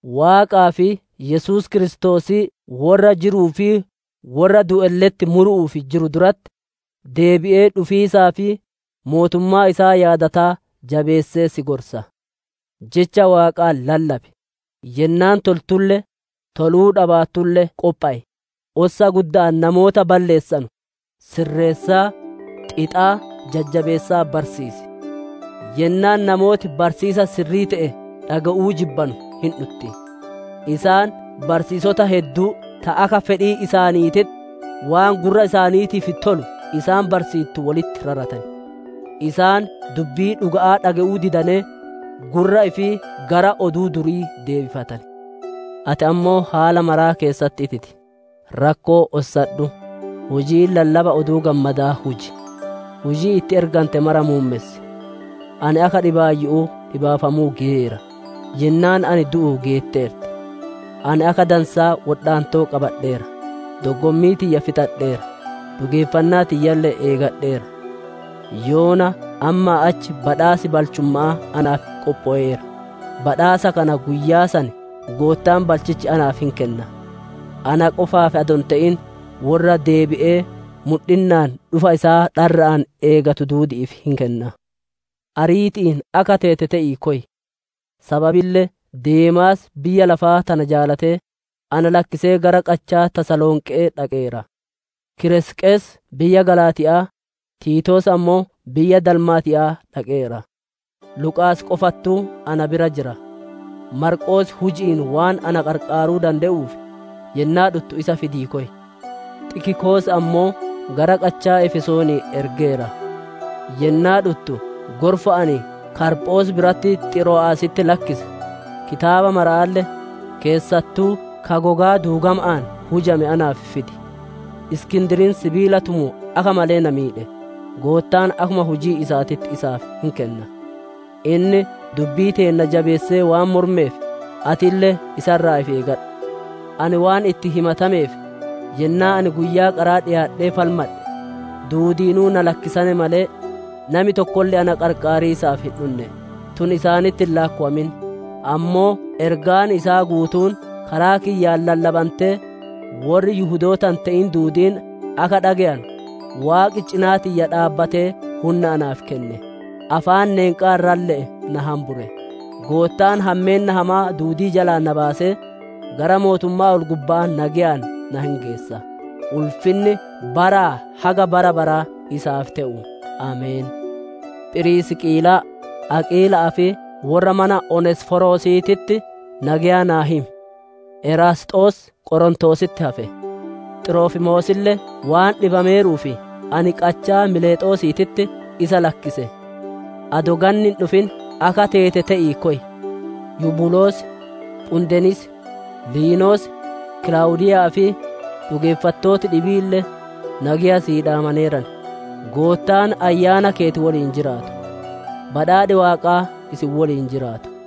Waaqaa fi Yesuus Kiristoosii worra jiruu fi worra du'elle'etti muru'uuf jiru duratti, deebi'ee dhufiisaa fi mootummaa isaa yaadataa jabeessee si gorsa. Jecha Waaqaa lallabi; yennaan toltulle, toluu dhabaattulle qophow; ossa gudda'aan namoota balleessanu sirreessaa, xixaa, jajjabeessaa barsiisi. Yennaan namooti barsiisa sirrii te'e dhage'uu jibbanu hin dhutti; isaan barsiisota hedduu ta akka fedhii isaaniititti, waan gurra isaaniitiif tolu isaan barsiittu wolitti raratan. Isaan dubbii dhuga'aa dhage'uu didanee, gurra ifii gara oduu durii deebifatan. Ati ammoo haala mara keessatti ititi; rakkoo ossadhu; hujii lallaba Oduu Gammadaa huji; hujii itti ergante mara muummessi. Ani akka dhibaayyu'uu dhibaafamuu geyeera; yennaan ani du'u geetteerti. Ani akka dansaa wodhaantoo qabadheera; doggommii tiyya fixadheera; dhugeeffannaa tiyyalle eegadheera. Yoona ammaa achi badhaas balchumma'aa naaf qophoweera; badhaasa kana guyyaa san Goottaan balchichi naaf hin kenna; ana qofaaf adoo hin te'in, worra deebi'ee mudhinnaan dhufa isaa dharra'aan eegatu duudi'iif hin kenna. Ariiti'iin akka teete te'ii koy. Sababille Deemaas biyya lafaa tana jaalatee, na lakkisee gara qachaa Tasalonqe'ee dhaqeera. Kiresqes biyya Galaatiya'aa, Tiitoos ammoo biyya Dalmaatiya'aa dhaqeera. Luqaas qofattuu na bira jira. Maarqoos huji'iin waan ana qarqaaruu dande'uuf, yennaa dhuttu isa fidii koy. Xikiqoos ammoo gara qachaa Efesoonii ergeera. Yennaa dhuttu gorfa ani Kaarphoos biratti Xiro'aasitti lakkise, kitaabota maramaalle, keessattuu ka gogaa duugama'aan hujame naaf fidi. Iskindiriin sibiila tumu akka malee na miidhe; Goottaan akkuma hujii isaatitti isaaf hin kenna. Inni dubbii teenna jabeessee waan mormeef, atille isa irraa ifi eegadhu. Ani waan itti himatameef yennaa ani guyyaa qaraa dhiyaadhee falmadhe, duudiinuu na lakkisane malee, nami tokkolle na qarqaariisaaf hin dhunne. Tun isaanitti hin laakkowamin! Ammoo ergaan isaa guutuun karaa kiyyaan lallabantee worri Yihudoota hin te'in duudiin akka dhage'anu, Waaqi cinaa tiyya dhaabbatee hunna naaf kenne. Afaan neenqaa irralle'ee na hambure. Goottaan hammeenna hamaa duudii jalaa na baasee, gara mootummaa ol-gubba'aa nageyaan na hin geessa. Ulfinni baraa haga bara baraa isaaf te'u! Ameen. Phirisqiilaa, Aqiila'aa fi worra mana oneesiforosiititti nageya naa himi. Eraasxoos Qorontoositti hafe; Xirofimoosille waan dhibameeruuf ani qachaa Miilexoosiititti isa lakkise. Adoo ganni hin dhufin akka teete te'ii koy. Yubuloos, Phudenis, Liinos, Kilaawudiiya'aa fi dhugeeffattooti dhibiille nageya sii dhaamaneeran. Goottaan ayyaana keeti woliin jiraatu. Badhaadhi Waaqaa isin woliin jiraatu.